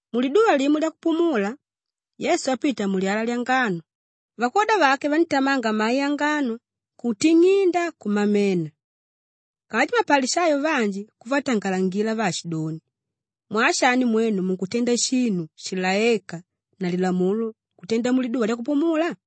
Muliduva limo lyakupumula, Yesu apita mulyala lyangano, vakwoda vake vandítamanga mai angano kuting'inda, kumamena. Kanji mapalishayo vanji kuvatangalangila vaashidoni, “Mwaa shani mwenu munkutenda shinu shilaéka na lilamulo kutenda muliduva lyakupumula?”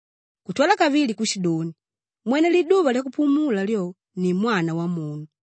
Kutwala kavili kushidoni, “Mwene liduva lyakupumula lyo ni Mwana Wamunu.”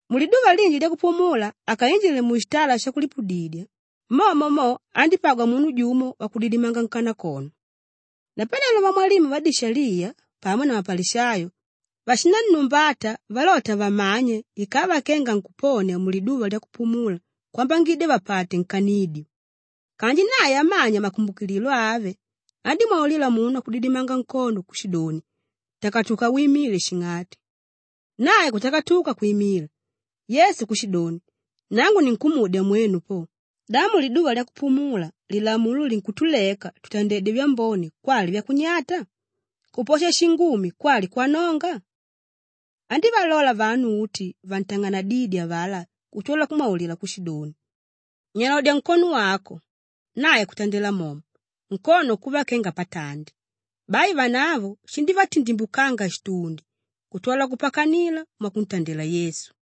Muliduva linji lyakupumula akainjile mushitala shakulipudidya, momo mo andípagwa munu jumo wakudidimanga nkanakono. Napanelo vamwalimu vadishaliya pamo na mapalishayo vashinannumbata valota vamanye ikava kenga ankuponia muliduva lyakupumula kwambangidya vapate nkanidyo. Kanji nae amanya makumbukililo ave, andímwaulila munu wakudidimanga nkono kushidoni, “Takatuka wimile shing'ati!” Nae kutakatuka kwimila. Yesu kushidoni, “Nangu ninkumudya mwenu po, da muliduva lyakupumula lilamulo linkutuleka tutandedye vyambone kwali vyakunyata? Kuposha shingumi kwali kwanonga?” Andívalola vanu uti vantang'anadídye avalá kutwala kumwaulila kushidoni, “Nyalodya nkono wako!” Nae kutandela momo, nkono kuva kenga patandi. Bai vanavo shindívatindimbukanga shitundi kutwala kupakanila mwakuntandela Yesu.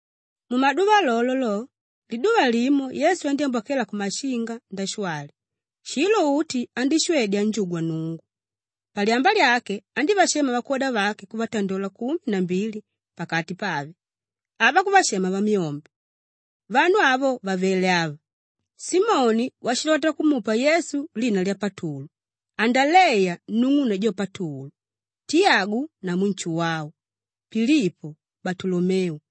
Mumaduva lolo lo, liduva limo Yesu andyámbwakela kumashinga ndashwali; shilo uti andíshwedya anjugwa Nnungu. Palyamba lyake andívashema vakwoda vake kuvatandola kumi na mbili pakati pave; ava kuvashema Vamyombe. Vanu avo vavele ava: Simoni washilota kumupa Yesu lina lya Patulu, Andaleya nung'une jo Patulu, Tiyagu namu Nshuwau, Pilipo, Balutolomeu,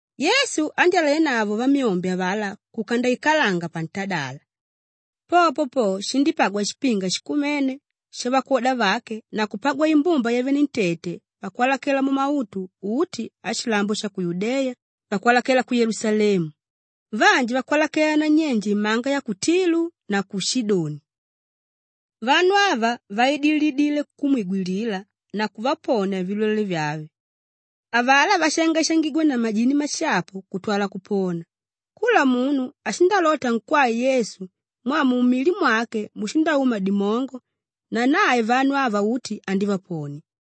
Yesu andyálenavo vamyombe avalá kuka ndaikalanga pantadala. Popo po, shindípagwa shipinga shikumene shavakwoda vake na kupagwa imbumba yavenentete vakwalakela mumautu uti ashilambo sha ku Yudeya, vakwalakela ku Yelusalemu, vanji vakwalakela nanyenje imanga ya ku Tilu na ku Shidoni. Vanu ava vaidilile kumwigwilila na kuvaponia vilwele vyave; avalá váshangaishangigwa na majini mashapu kutwala kupona. Kula munu ashindalota ankwae Yesu mwaa mumili mwake mushindauma dimongo na nae vanu ava uti andívaponia.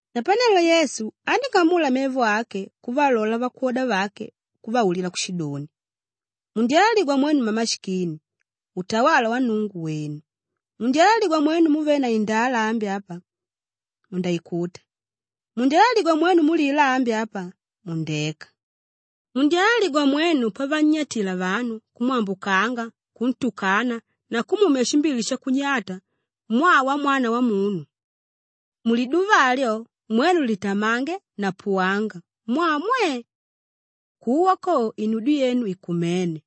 Napanelo Yesu andíng'amula mevo ake kuvalola vakwoda vake kuvaulila kushidoni, “Mundyalaligwa mwenu mmamashikini, utawala wa Nnungu, wènu. Mundyalaligwa mwenu múvele na indala ambi apa, mundaikuta. Mundyalaligwa mwenu múlila ambi apa, mundeka. “Mundyalaligwa mwenu pavannyatila vanu, kumwambukanga, kuntukana na kumumya shimbili shakunyata mwaa wa Mwana Wamunu. Muliduva alyo, mwenu litamange na puwanga mwaa mwe! Kuwa ko, inudyo yenu ikumene.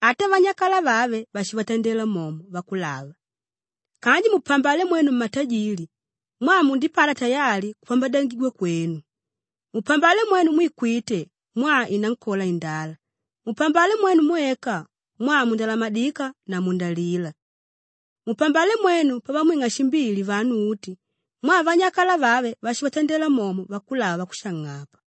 Ata vanyakala vave vashivatandela momo vakulava. “Kanji mupambale mwenu mmatajili mwaa mundipata tayali kupambadyangigwa kwenu. Mupambale mwenu mwíkwite mwaa inankola indala. Mupambale mwenu mwéka mwaa mundalamadika na mundalila. “Mupambale mwenu pavamwing'a shimbili vanu uti mwaa vanyakala vave vashivatandela momo vakulava vakushang'apa.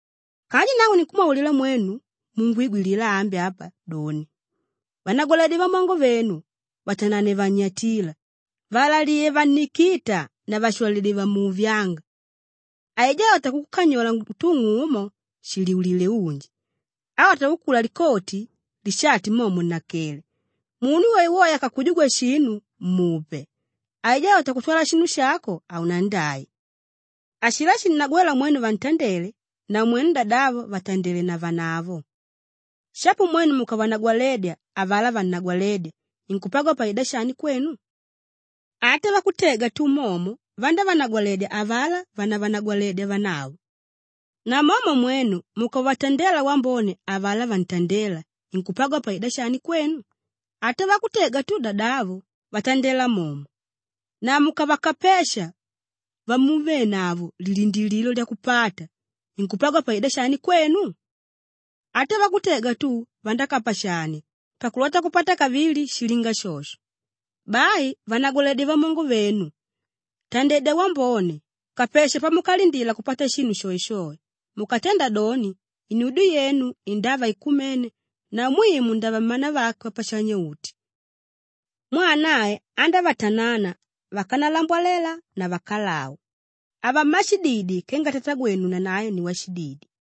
“Kanji nangu ninkumwaulila mwenu múngwigwilila ambi apa doni, vanagwaledye vamongo venu, vatanane vannyatíla, vaalaliye vannikíta na vashwalidye vamuuvyánga. Aijá álota kukukanyola utung'u umo, nshiliulile unji. Álota kukula likoti, lishati momo nnakele. Munu woewoe akakujugwa shinu, mupe; aijá álota kutwala shinu shako haunandai. Ashilá shinnagwéla mwenu vantandele, namwenu dadavo vatandele navanavo. Shapo mwenu mukavanagwaledya avalá vannagwalédya, inkupagwa paida shani kwenu? Ata vakutega tu momo vandávanagwaledya avalá vánavanagwaledya vanavo. Namomo mwenu mukavatandela wambone avalá vantandéla, inkupagwa paida shani kwenu? Ata vakutega tu dadavo, vandátandela momo. Na mukavakapesha vamuvenavo lilindilililo lyakupata, inkupagwa paida shani kwenu? Ata vakutega tu vandákapashania pakulota kupata kavili shilinga shosho. Bai vanagwaledye vamongo venu, tandedya wambone, kapesha pamukalindila kupata shinu shoeshoe. Mukatenda doni, inudyo yenu indava ikumene na mwiu mundava mmanavake Wapashanya-uti. Mwaa nae andávatanana vakanalambwalela na vakalau. “Ava mmashididi kenga Tatagwenu nanae ni washididi.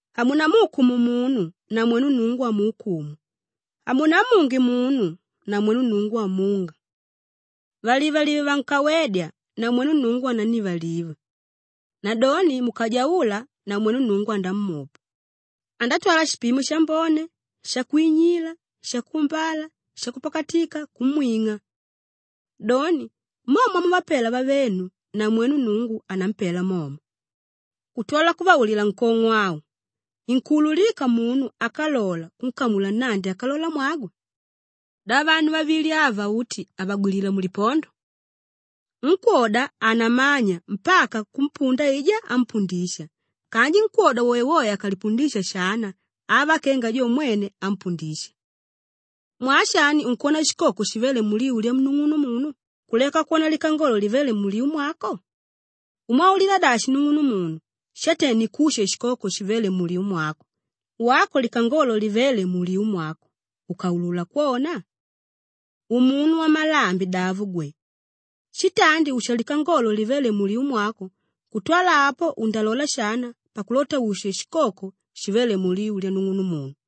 “Hamunamuukumu munu namwenu Nnungu hamuukumu. Hamunamunge munu namwenu Nnungu hamunga. Valivalive vankawédya namwenu Nnungu anannivaliva. Nadoni mukajaula namwenu Nnungu andamupa; andatwala shipimo shambone, shakwinyila, shakuumbala, shakupakatika kumwing'a. Doni, mo mwamuvapela vavenu, namwenu Nnungu anampela momo.” Kutwala kuvaulila nkong'o au, “Inkuululika munu ákalola kunkamula nnandi ákalolamwagwe? Da vanu vavili ava uti havagwilila mulipondo? Nkwóda hanamanya mpaka kumpunda aijá ámpundisha kanji nkwóda woewoe akalipundisha shana ava kenga jo mwene ámpundisha. “Mwaa shani unkwona shikoko shivéle muliu lyanung'unumunu kuleka kwona likangolo livéle muliu mwako? Ùmwaulila dashi nung'unumunu, ‘Shate nikushe shikoko shivéle muliu mwako,’ wako likangolo livéle muliu mwako, ùkaulula kwona? Umunu wamalambi davo gwe! Shitandi usha likangolo livéle muliu mwako kutwala apo undalola shana pakulota ushe shikoko shivéle muliu lyanung'unumunu.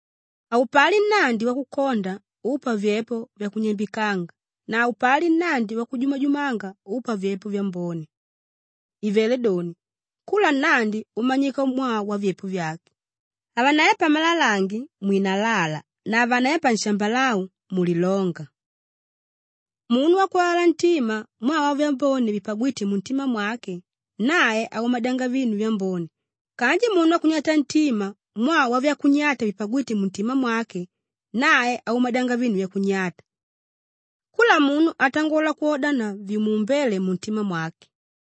“Haupali nnandi wakukonda úpa vyepo vyakunyambikanga na haupali nnandi wakujumajumanga úpa vyepo vyambone. Ivelé doni, kula nnandi umanyika mwaa wavyepo vyake; havanepa malalange mwinalala na havanepa nshambalau mulilonga. Munu wakwalala ntima mwaa wavyambone vipagwíte muntima mwake, nae aumadyanga vinu vyambone kanji munu wakunyata ntima mwaa wavyakunyata vipagwíte muntima mwake, nae aumadyanga vinu vyakunyata. Kula munu atangola kwodana na vimuumbéle muntima mwake.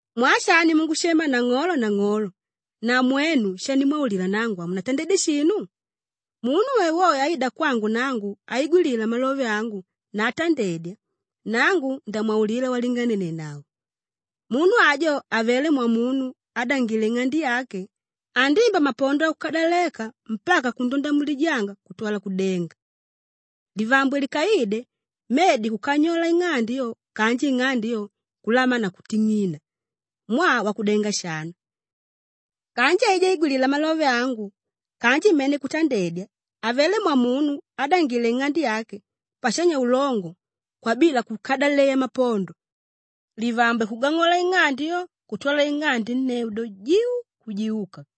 “Mwaa shani mungushema ‘Nang'olo, Nang'olo’ na mwenu shanimwaulila nangu hamunatandeya shinu? Munu woewoe áida kwangu nangu áigwilila malove angu na átandedya, nangu ndamwaulila walinganenenavo. Munu ajo avelé mwamunu ádangile ing'ande yake; andimba mapondo akukadaleka mpaka kundonda mulijanga kutwala kudenga. Livambwe likaide, medi kukanyola ing'ande yo kanji ing'ande yo, kulamana na kuting'ina mwaa wakudenga shana. Kanji aijá áigwilila malove angu kanji mene kutandedya, avelé mwamunu ádangile ing'ande yake pashanya ulongo kwabila kukadaleya mapondo; livambwe kugang'ola ing'ande yo kutwala ing'ande nneu do, jiu, kujiuka.”